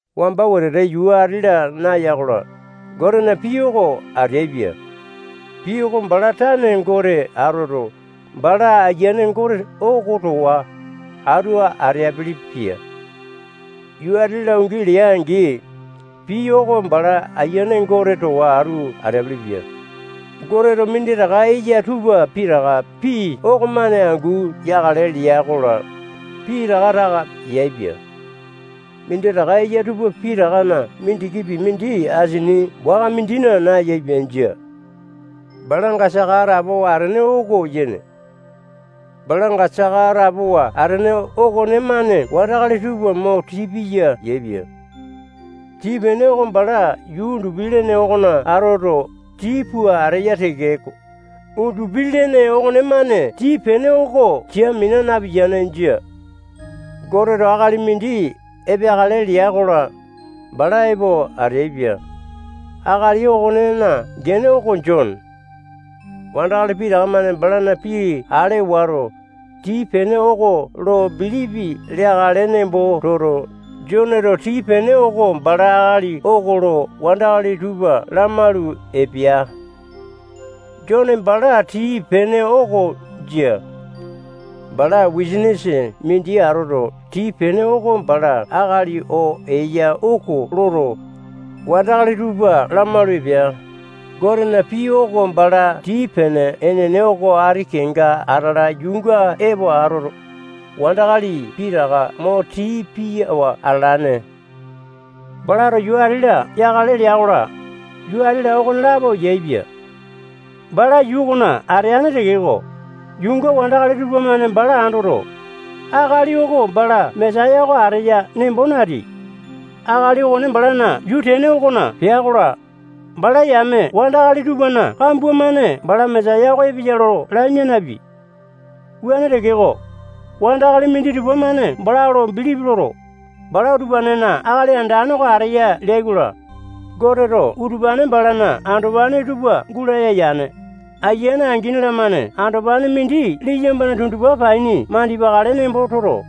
Wamba wetete yuu ati-la naya-kola, Gotena pii oko ateaipia. Pii oko bala tane Gote atoto, bala Ayiane Gote oko towa atu ateapele-pia. Yuu ati-la ungi lea-angi, pii oko bala Ayiane Gote towa atu ateapele-pia. Goteto minditaka eya tupa pitaka pii okomane angu yakale lea-kola, pitaka taka yaepia. Minditaka eya tupa pitakana mindikipi mindi asini waka mindina nayaepia. Jia. Balanga saka atapowa atene oko yene. Balanga saka atapowa atene okonemane wandakali tupa mo tii piya yaepia. Tii-pene oko bala yuu undupi-lene okona atoto, tii pua ateya tekeko, undupi-lene okonemane tii-pene oko sia mina napiyane. Jia. Goteto akali mindi epeakale lea-kola, bala epo ateaipia. Akali okonena gene oko Jone. Wandakali pitaka-mane balana pii ale wato, tii-pene oko lo bilipi leakale nembo toto, Joneto tii-pene oko bala akali oko lo wandakali tupa lamalu epea. Jone bala tii-pene oko jia. Bala wisanisa mindi atoto, tii-pene oko bala akali oo eya oko loto, wandakali tupa lamalu epea. Gotena pii oko bala tii-pene enene oko ati kenga atala yuunga epo atoto, wandakali pitaka mo tii piyawa atalane. Balato yuu ati-la yakale lea-kola, yuu ati-la okolapo yaepia. Bala yuu okona ateane tekeko, yuunga wandakali tupamane bala andoto, akali oko bala Mesaya oko ateya nembo nateai. Akali okone balana yuu tene okona pea-kola, bala yame wandakali tupana kambua-mane bala Mesaya oko epeya lo lamia napeai. Wuane tekeko, wandakali minditupa-mane bala lo bilipi loto, bala utupanena Akali Andane oko ateya leai-kola, Goteto utupane balana andopane tupa gulaya yane. Ayiane angini-lamane andopane mindi liyambana tundupa paini mandipakale nembo toto,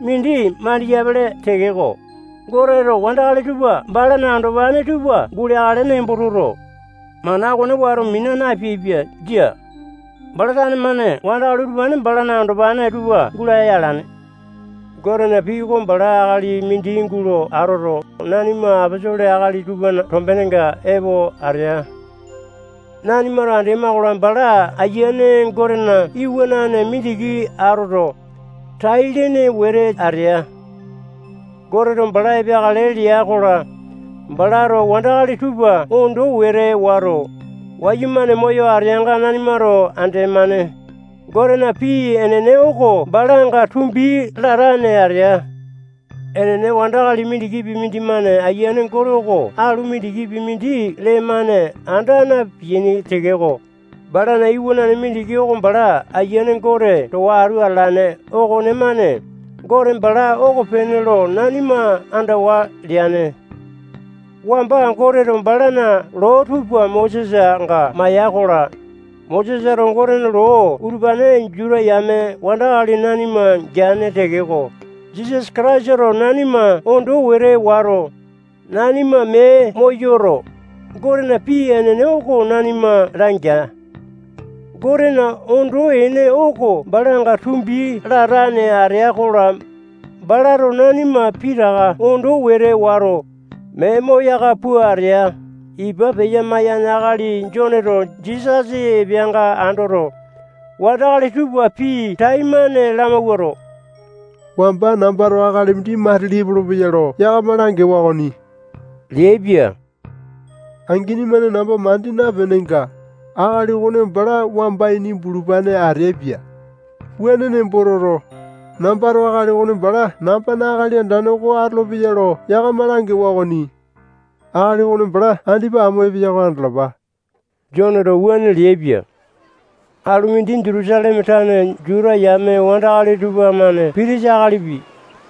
mindi mandiyapele tekeko, Goteto wandakali tupa balana andopane tupa guleakale nembo toto, mana okone wato mina napeaipia. Jia. Bala tane-mane wandakali utupane balana andopane tupa gulaya alane. Gotena pii oko bala akali mindi gulo atoto, nanima aposolo akali tupana tombenenga epo atea. Nanimato andema-kola, bala Ayiane Gotena iwanane mindiki atoto, tai-lene wete atea. Goteto bala epeakale lea-kola, balato wandakali tupa ondo wete wato, wayumane moyo ateanga, nanimato andemane. Gotena pii enene oko balanga tumbi latane atea. Enene, wandakali mindikipi mindimane Ayiane Gote oko alu mindikipi mindi lee-mane anda napeaini tekeko, balana Iwanane mindiki oko bala Ayiane Gote towa atu atalane okonemane Gote bala okopene lo nanima andawa leane. Wamba Goteto balana loo tupa Mosesanga maiya-kola, Mosesato Gotena loo utupane Juta yame wandakali nanima geane tekeko, Jisasa Kataisato nanima ondo wete wato, nanima mee moyoto, Gotena pii enene oko nanima langea. Gotena ondo ene oko balanga tumbi latane atea-kola, balato nanima pitaka ondo wete wato, mee moyaka pua atea. Ipa peya-maiyane akali Joneto Jisasa epeanga andoto, wandakali tupa pii taimane lamawuato, wamba nambato akali mindi matili epolopeya lo yakama langewa okoni leaipia. Angini-mane namba mandi napenenga, akali okone bala wamba ini bulupane ateaipia. Wuane nembo toto, nambato akali okone bala nambana Akali Andane oko atolopeya lo yakama langewa okoni. Akali okone bala andipa amo epeya oko andalapa. Joneto wuane leaipia. Alu mindi, Jutusaleme tane Juta yame wandakali tupamane pitisa akalipi,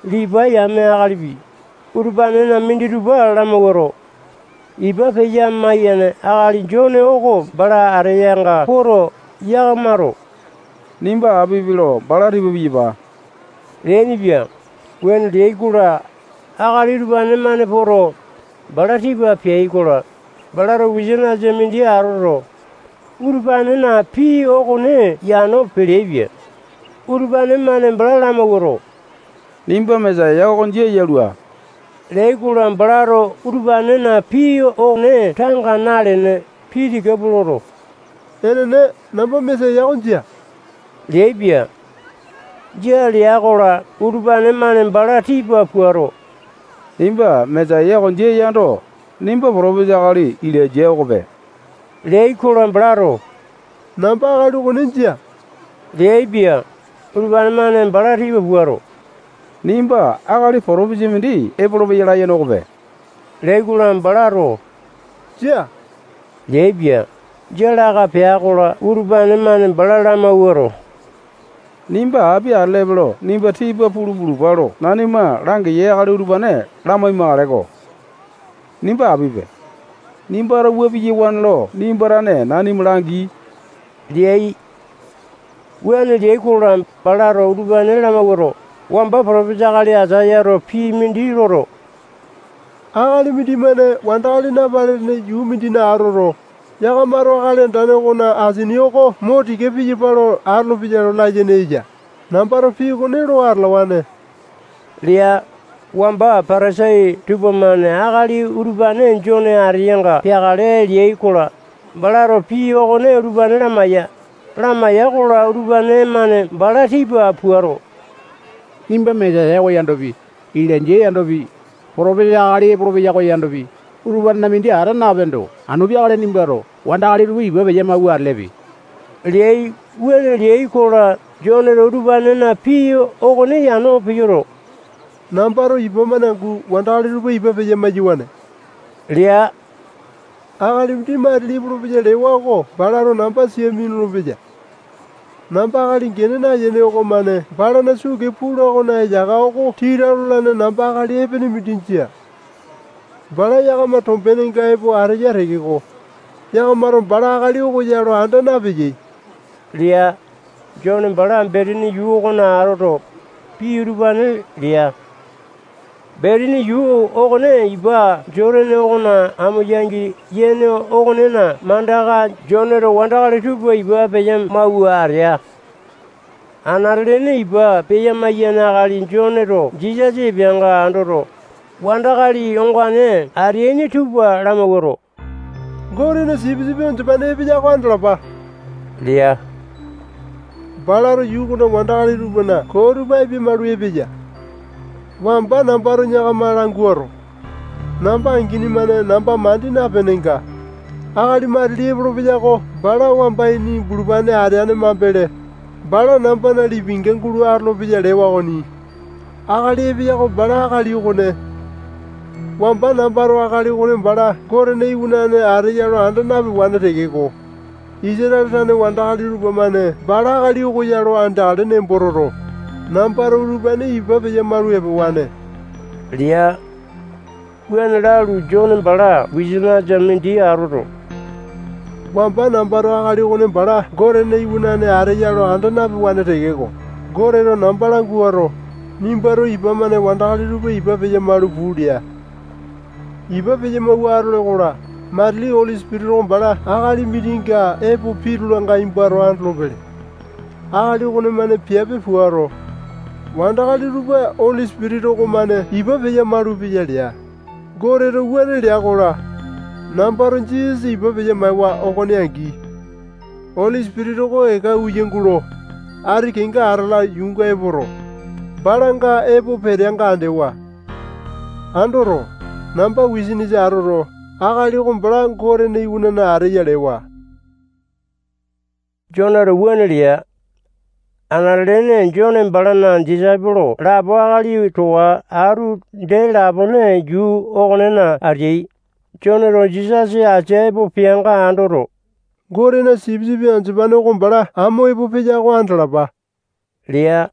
Lipai yame akalipi, utupanena minditupa lamawuato, ipa peya-maiyane akali Jone oko bala ateyanga poto, yakamato nimba apipe lo bala tipa piyapa leainipia. Wuane leai-kola, akali utupane-mane poto, bala tipa peai-kola, balato wisanisa mindi atoto, utupanena pii okone yano peleaipia. Utupane-mane bala lamawuato, nimba Mesaya oko jia yalua leai-kola, balato utupanena pii okone tanga nalene, pii tika pua loto, enene, namba Mesaya oko jia leaipia. Jia lea-kola, utupane-mane bala tipa puato, nimba Mesaya oko jia yando, nimba potopesa akali Ilainja okope leai-kola, balato namba akali okone jia leaipia. Utupane-mane bala tipa puato, nimba akali potopisa mindi epolopeya layene okope leai-kola, balato jia leaipia. Jia laka pea-kola, utupane-mane bala lamawuato, nimba api atelepe lo nimba tipa pulu pulupa lo nanima langiyai akali utupane lamai-makaleko. Nimba apipe. Nimbato wua piyawane lo nimba tane nanima langi leai. Wuane leai-kola, balato utupane lamawuato, wamba potopisa akali Aisayato pii mindi loto, akali mindimane wandakali napalene yuu mindina atoto, yakamato Akali Andane okona asini oko mo tika piyapa lo atolopeya layene eya. Nambato pii okone lo atalawane lea. Wamba Patasai tupamane akali utupane Jone ateanga peakale leai-kola, balato pii okone utupane lamaiya. Lamaiya-kola, utupane-mane bala tipa puato, nimba Mesaya oko yandopi, Ilainja yandopi, potopisa akali epolopeya oko yandopi, utupanena mindi ata napeendo, anu peakale nimbato wandakali tupa ipa peya-mawua atelepe leai. Wuane leai-kola, Joneto utupanena pii okone yano peyoto, nambato ipa-mane angu wandakali tupa ipa peya-maiyawane lea. Akali mindi matili epolopeya lewa oko balato namba sia minulu-peya. Namba akali gene nayene okomane balana suu kee pula okona eyaka oko tita lolane namba akali epene mindi jia. Bala yakama tombenga epo ateya tekeko, yakamato bala akali oko ya lo anda napeyai lea. Jone bala Betani yuu okona atoto, pii utupane lea. Betani yuu okone ipa Jotane okona amo yangi yene okonena mandaka Joneto wandakali tupa ipa peya-mawua atea. Anate-lene ipa peya-maiyane akali Joneto Jisasa epeanga andoto, wandakali ongane ateaini tupa lamawuato, Gotena sipisipi andopane epeya oko andalapa lea. Balato yuu okona wandakali tupana koo tupa apia-malu epeya. Wamba nambato yakama languato, namba angini-mane namba mandi napenenga, akali matili epolopeya oko bala wamba ini bulupane ateane mambele, bala nambana lipinga gulo atolopeya lewa okoni. Akali epeya oko bala akali okone. Wamba nambato akali okone bala Gotena Iwanane ateya lo anda napewane tekeko, Isatale tane wandakali tupamane bala akali oko ya lo andeakale nembo toto, nambato utupane ipa peya-malu epewane lea. Wuane lalu, Jone bala wisanisa mindi atoto, wamba nambato akali okone bala Gotena iwanane ateya lo anda napewane tekeko, Goteto namba languato, nimbato ipa-mane wandakali tupa ipa peya-malu puu lea. Ipa peya-mawua atole-kola, matili Oli Sipitisa oko bala akali mindinga epo pitulanga nimbato andolopele. Akali okonemane piape puato, wandakali tupa Oli Sipitisa okomane ipa peya-malupeya lea. Goteto wuane lea-kola, nambato Jisasa ipa peya-maewa okone angi, Oli Sipitisa oko eka uya gulo, ati kenga atala yuunga epoto, balanga epo peteanga andewa. Andoto, namba wisanisa atoto, akali oko bala Gotena Iwanane ateya lewa. Joneto wuane lea. Anate-lene Jone balana disaipolo lapo akali towa atu dee lapone yuu okonena ateai. Joneto Jisasa asia epo peanga andoto, Gotena sipisipi andopane oko bala amo epo peya oko andalapa lea.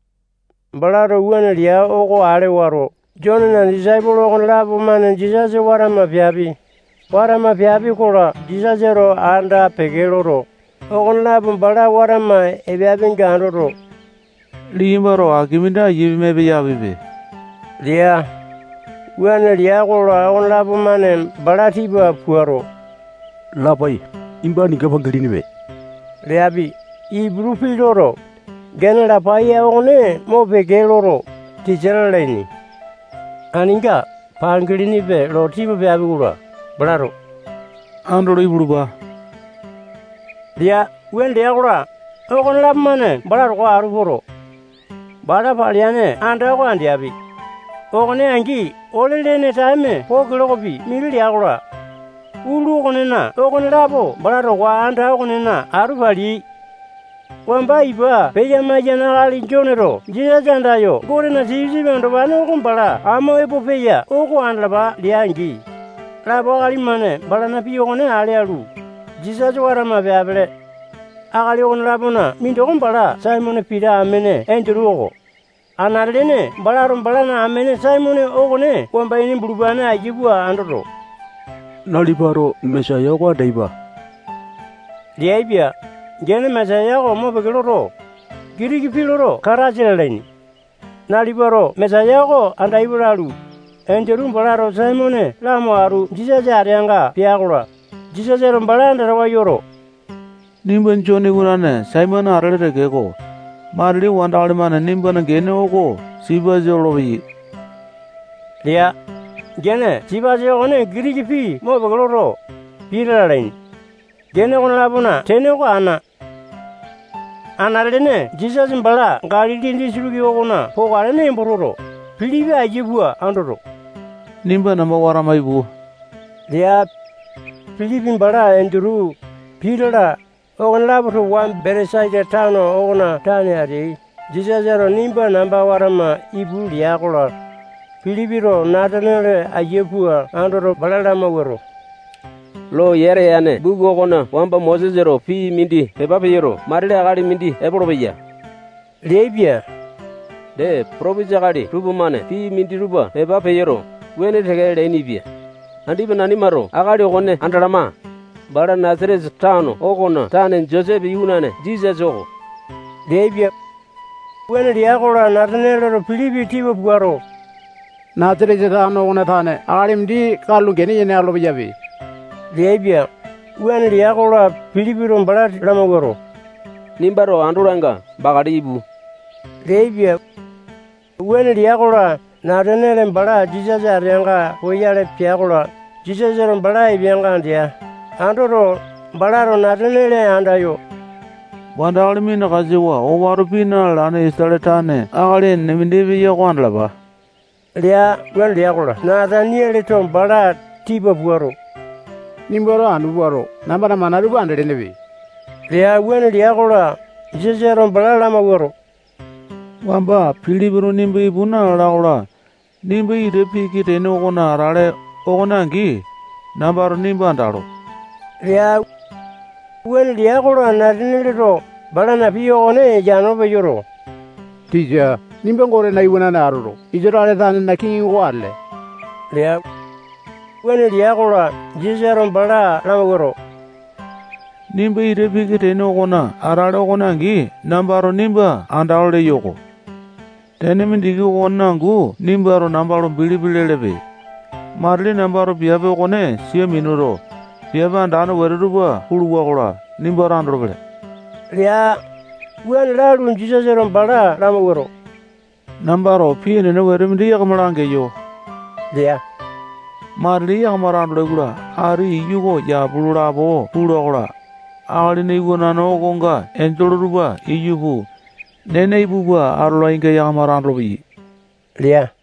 Balato wuane lea oko ale wato, Jonena disaipolo okonelapo-mane Jisasa watama peapi. Watama peapi-kola, Jisasato anda-peke loto, okonelapo bala watama epeapinga andoto, liyambato aki mindi aiya pima epeyapipe lea. Wuane lea-kola, okonelapo-mane bala tipa puato, Lapai, nimba aninga pangilinipe leapi. Iputu pii loto, gene Lapai okone mopeke loto, tisa lalaini. Aninga pangilinipe lo tipa peapi-kola, balato andolo ipulupa lea. Wuane lea-kola, okonelapo-mane bala towa atu poto, bala paleane anda oko andeapi. Okone angi, ole-lene taeme poo kilokopi mindi lea-kola, utulu okonena okonelapo bala towa anda okonena atu paleai. Wamba ipa peya-maiyane akali Joneto Jisasa andayo Gotena sipisipi andopane oko bala amo epo peya oko andalapa lea-angi, lapo akali-mane balana pii okone ale alu, Jisasa watama peapele. Akali okone-lapona mindoko bala Saimone Pita amene Endutu oko. Anate-lene balato balana amene Saimone okone wamba ini bulupane aiya pua andoto, nalipato Mesaya oko andaipa leaipia. Gene Mesaya oko mopeke loto, Gitiki pii lo Kataisa lalaini. Nalipato Mesaya oko andaipa lalu, Endutu balato Saimone lamo atu Jisasa ateanga pea-kola, Jisasato bala andatawa yoto, nimba Jone iwanane Saimone atele tekeko, matili wandakali-mane nimbana gene oko Sipasa lolopeyai lea. Gene Sipasa okone Gitiki pii mopeke loto, Pita lalaini. Gene okone-lapona tene oko ana. Anate-lene Jisasa bala Galili disitiki okona pokale nembo toto, Pilipi aiya pua andoto, nimba namba watama ipu lea. Pilipi bala Endutu, Pita-la, okonelapo towa Betesaita tano okona tane ateai. Jisasato nimba namba watama ipu lea-kola, Pilipito Nataniale aiya pua andoto, bala lamawuato, loo yata yane buku okona wamba Mosesato pii mindi pepa peyoto, matili akali mindi epolopeya leaipia. Dee, Potopisa akali tupamane pii minditupa pepa peyoto, wuane teke leainipia. Andipa nanimato akali okone andalama. Bala Nasatesa tano okona tane Josepe iwanane Jisasa oko leaipia. Wuane lea-kola, Natanialeto Pilipi tipa puato, Nasatesa tano okona tane akali mindi katulo gene yene atolo-peyape leaipia. Wuane lea-kola, Pilipito bala lamawuato, nimbato andolanga, bakale ipu leaipia. Wuane lea-kola, Nataniale bala Jisasa ateanga poyale pea-kola, Jisasato bala epeanga andea. Andoto, balato Nataniale andayo, wandakali minakasawa owato pii na-lalane Isatale tane akali enene mindi epeya oko andalapa lea. Wuane lea-kola, Natanialeto bala tipa puato, nimbato anu puato, nambana mana tupa andelenepe lea. Wuane lea-kola, Jisasato bala lamawuato, wamba Pilipito nimba ipu nalala-kola, nimba ita piki tene okona atale okone angi, nambato nimba andalo lea. Wuane lea-kola, Natanialeto balana pii okone yano peyoto, tisa, nimba Gotena iwanane atoto, Isatale tanena kiŋi oko atele lea. Wuane lea-kola, Jisasato bala lamawuato, nimba ita piki tene okona atale okone angi, nambato nimba andalo leyo-ko. Tene mindiki okonena angu nimbato namba lo bilipi lelepe. Matili nambato piape okone sia minuto, piape andane wete tupa puluwa-kola, nimbato andolopele lea. Wuane lalu, Jisasato bala lamawuato, nambato pii enene wete mindi yakama langeyo lea. Matili yakamato andolai-kola, ati iyu oko yapu lapo pula-kola, Akalina Iwanane okonga enjole tupa iyu puu, nena ipu pua atolainga yakamato andolopeyai lea.